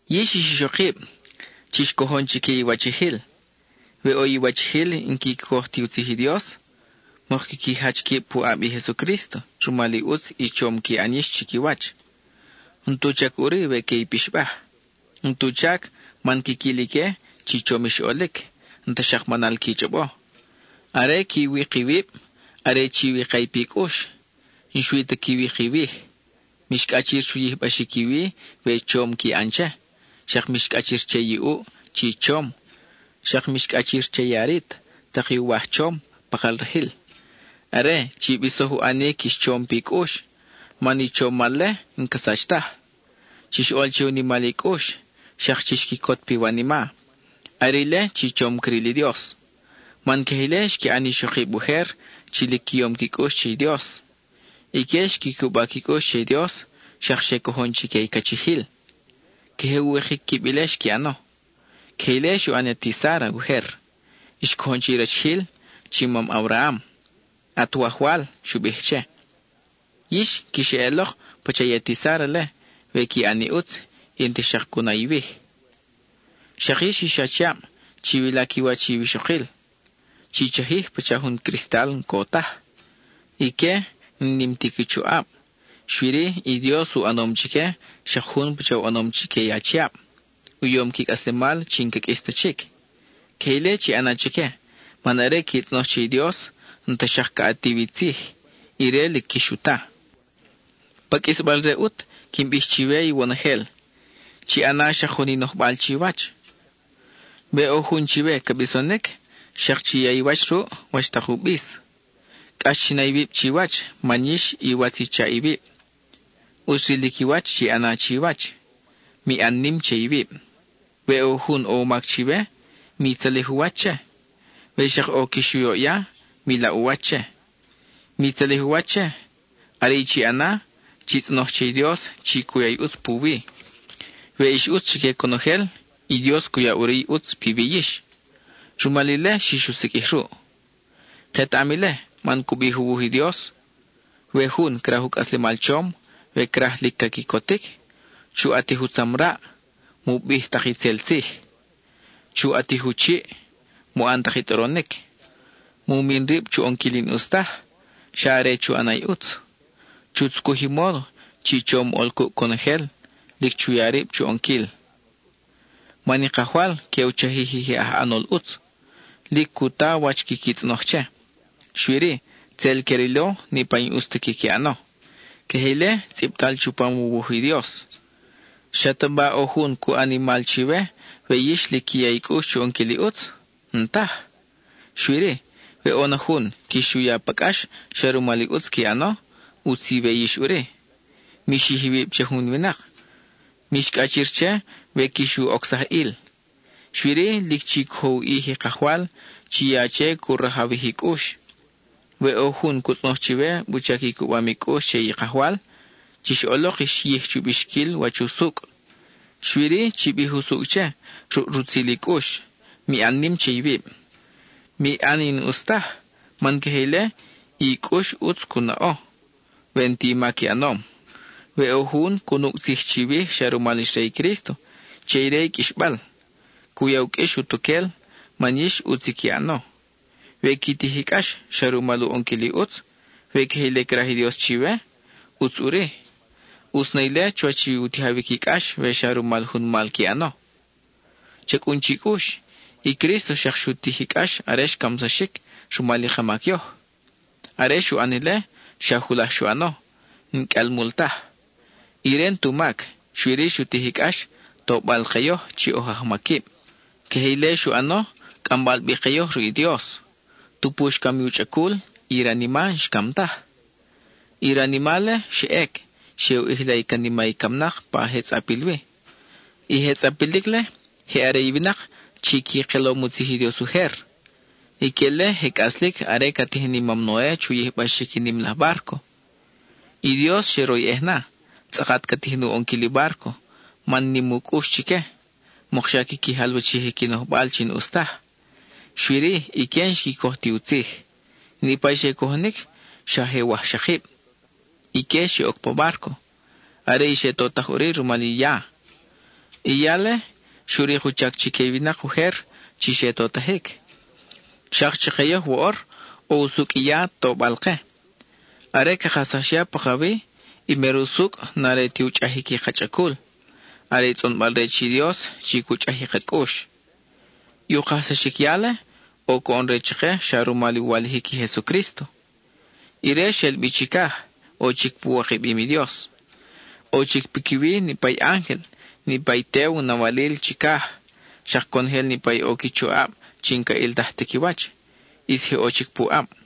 Yix ix ixokib, chix cojon chique i iwachijil. We ʼo i iwachijil n-quiqui coj ti u tzij i Dios, mok quiqui jach quib puʼab i Jesucrísto rumal i ʼutz i chom qui ʼan yix chiquiwach. N-tu chac ʼuri que i pixbaj. N-tu chac, man quiquil ique chi chom ix ʼolic, n-ta xak manal qui chʼobo. Are qui wik iwib are chi wika i pi cʼux, n-xui ta qui wik iwij. Mix cʼachir chu yijbaxic i wi we chom qui ʼan che, xak mix cʼachir che i ʼuʼ chi chom, xak mix cʼachir che i arit, tak i uwaj chom, pakal rajil. Are, chi bisoj u ʼanic ix chom pi cʼux, man i chomal-le n-ca sach taj. Chix ʼol che u nimal i cʼux; xak chix quicot piwanima. Are ile chi chom cril i Dios. Man queje ile xqui ʼan i ixokib ujer chi lic qui yom qui cʼux che i Dios. Ique xqui cuba qui cʼux che i Dios, xak xe cojon chique i cachijil; queje u wikic quib ile xqui ʼano. Queje ile xu ʼan i ati Sára ujer, xcojon che i rachijil, chi mam Abraham: “At wajwal”, xu bij che. Yix, quix eʼelok pacha i ati Sára-le we qui ʼan i ʼutz, y n-ta xak cu na iwij. Xak yix ix achiab, chiwila qui wach i iwixokil; chi chajij pacha jun cristal n-co taj. Ique n-nim ti qui choʼab, xui-ri, i Dios u ʼanom chique xak jun pacha u ʼanom chique i achiab: u yom qui cʼaslemal chi n-ca qʼuis ta chic. Queje ile chi ʼana chique, man are qui tzʼonoj che i Dios, n-ta xak ca ʼatiw i tzij; ire lic quix u ta. Pa qʼuisbal-re ʼut, quin bij chiwe iwonojel: chi ʼana xak jun i nojbal chiwach; we ʼo jun chiwe ca bisonic, xak chi ya i wach ruʼ, wach tak u bis; cʼax chi na iwib chiwach man yix iwatz i chaʼ iwib. ʼUtz rilic i wach chi ʼana chiwach; mi ʼan nim che iwib. We ʼo jun ʼo u mac chiwe, mi tzalij u wach che. We xak ʼo quix u yoʼya, mi laʼ u wach che. Mi tzalij u wach che, are i chi ʼana, chi tzʼonoj che i Dios chi cu ya i ʼutz puwi. We ix ʼutz chique conojel, i Dios cu ya ʼuri i ʼutz piwi yix; rumal ile xix u siqʼuij ruʼ. Ketaʼam ile, man cu bij u wuj i Dios: We jun craj u cʼaslemal chom, we craj lic ca quicotic, chu ʼatij utzamraʼ; mu bij tak itzel tzij; chu ʼatij u chiʼ; mu ʼan tak i tʼoronic. Mu min rib chu ʼonquil i n-ʼus taj, xa are chu ʼana i ʼutz. Chu tzucuj i módo chi chom ʼol cuʼ conojel; lic chu ya rib chu ʼonquil. Man i Kajwal que u chajij i je aj ʼanol ʼutz, lic cu ta wach quiqui tzʼonoj che, xui-ri, tzel que rilo niʼpa i n-ʼus ta quiqui ʼano. (Queje ile tzʼibtal chupam u wuj i Dios.) ¿Xataba ʼo jun cu ʼan i mal chiwe, we yix lic qui ya i cʼux chu ʼonquil i ʼutz? N-taj. Xui-ri, we ʼo na jun quix u ya pa cʼax xa rumal i ʼutz qui ʼano, ʼutz iwe yix ʼuri. Mi xij iwib che jun winak; mix cʼachir che we quix u ocsaj ʼil. Xui-ri, lic chi cojo u ʼij i Kajwal, chi ya che cu rajawij i cʼux. We ʼo jun cu tzʼonoj chiwe wuchac i cubam i cʼux che i Kajwal, chix ʼolok ix yij chu bixquil wach usucʼ, xui-ri, chi bij usucʼ che, ruʼ rutzil i cʼux, mi ʼan nim che iwib. Mi ʼan i n-ʼus taj, man queje ile, i cʼux ʼutz cu naʼo we n-ti mac i ʼanom. We ʼo jun cu nucʼ tzij chiwij xa rumal ix re i Crísto, che ire i qʼuixbal. Cu ya u qʼuix utuquel, man yix ʼutz i qui ʼano. We qui tij i cʼax xa rumal u ʼonquil i ʼutz, we queje ile craj i Dios chiwe, ʼutz ʼuri. ʼUtz na ile chuwach u tijawic i cʼax we xa rumal jun mal qui ʼano. Cha cʼun chi cʼux, i Crísto xak xu tij i cʼax are xcamsaxic rumal i ka mac yoj. Are xu ʼan ile, xa julaj xu ʼano, n-qʼuial mul taj. Ire n-tu mac, xui-ri xu tij i cʼax, tobal ke yoj chi oj ajmaquib. Queje ile xu ʼano, cʼambal bi ke yoj ruʼ i Dios. Tupu xcam i u chʼacul, i ranima n-xcam taj. I ranima-le xa ʼec, xe u ʼijla i canima i camnak pa je tzʼapil wi. I je tzʼapilic-le, je are i winak chi qui kelom u tzij i Dios ujer. Ique-le je cʼaslic are ca tijin i mam Noe chu yijbaxic i nim laj bárco. I Dios xe royʼej na, tzʼakat ca tijin u ʼonquil i bárco man nim u cʼux chique, mokxa quiqui jalwachij i qui nojbal chi n-ʼus taj. Xui-ri, ique n-xqui coj ti u tzij. Niʼpa i xe cojonic, xa je wajxakib; ique xe oc pa bárco. Are i xe totaj ʼuri rumal i ya. I ya-le, xu rik u chac chique i winak ujer chi xe totajic; xak chake yoj, ʼo usucʼ i ya tobal-ke. Are ca kajsax ya pakawi, i mer usucʼ n-are ti u chʼajic i ka chʼacul, are tzʼonbal-re che i Dios chi cu chʼaj i ka cʼux. I u kajsaxic ya-le ʼo coʼon re chake xa rumal u walijic i Jesucrísto. Ire xel bi chicaj; ʼo chic pu wikabim i Dios. ʼO chic piquiwi niʼpa i ángel, niʼpa i tew nawalil chicaj, xak conojel niʼpa i ʼo qui choʼab chi n-ca ʼiltaj ta qui wach; ʼis je ʼo chic puʼab.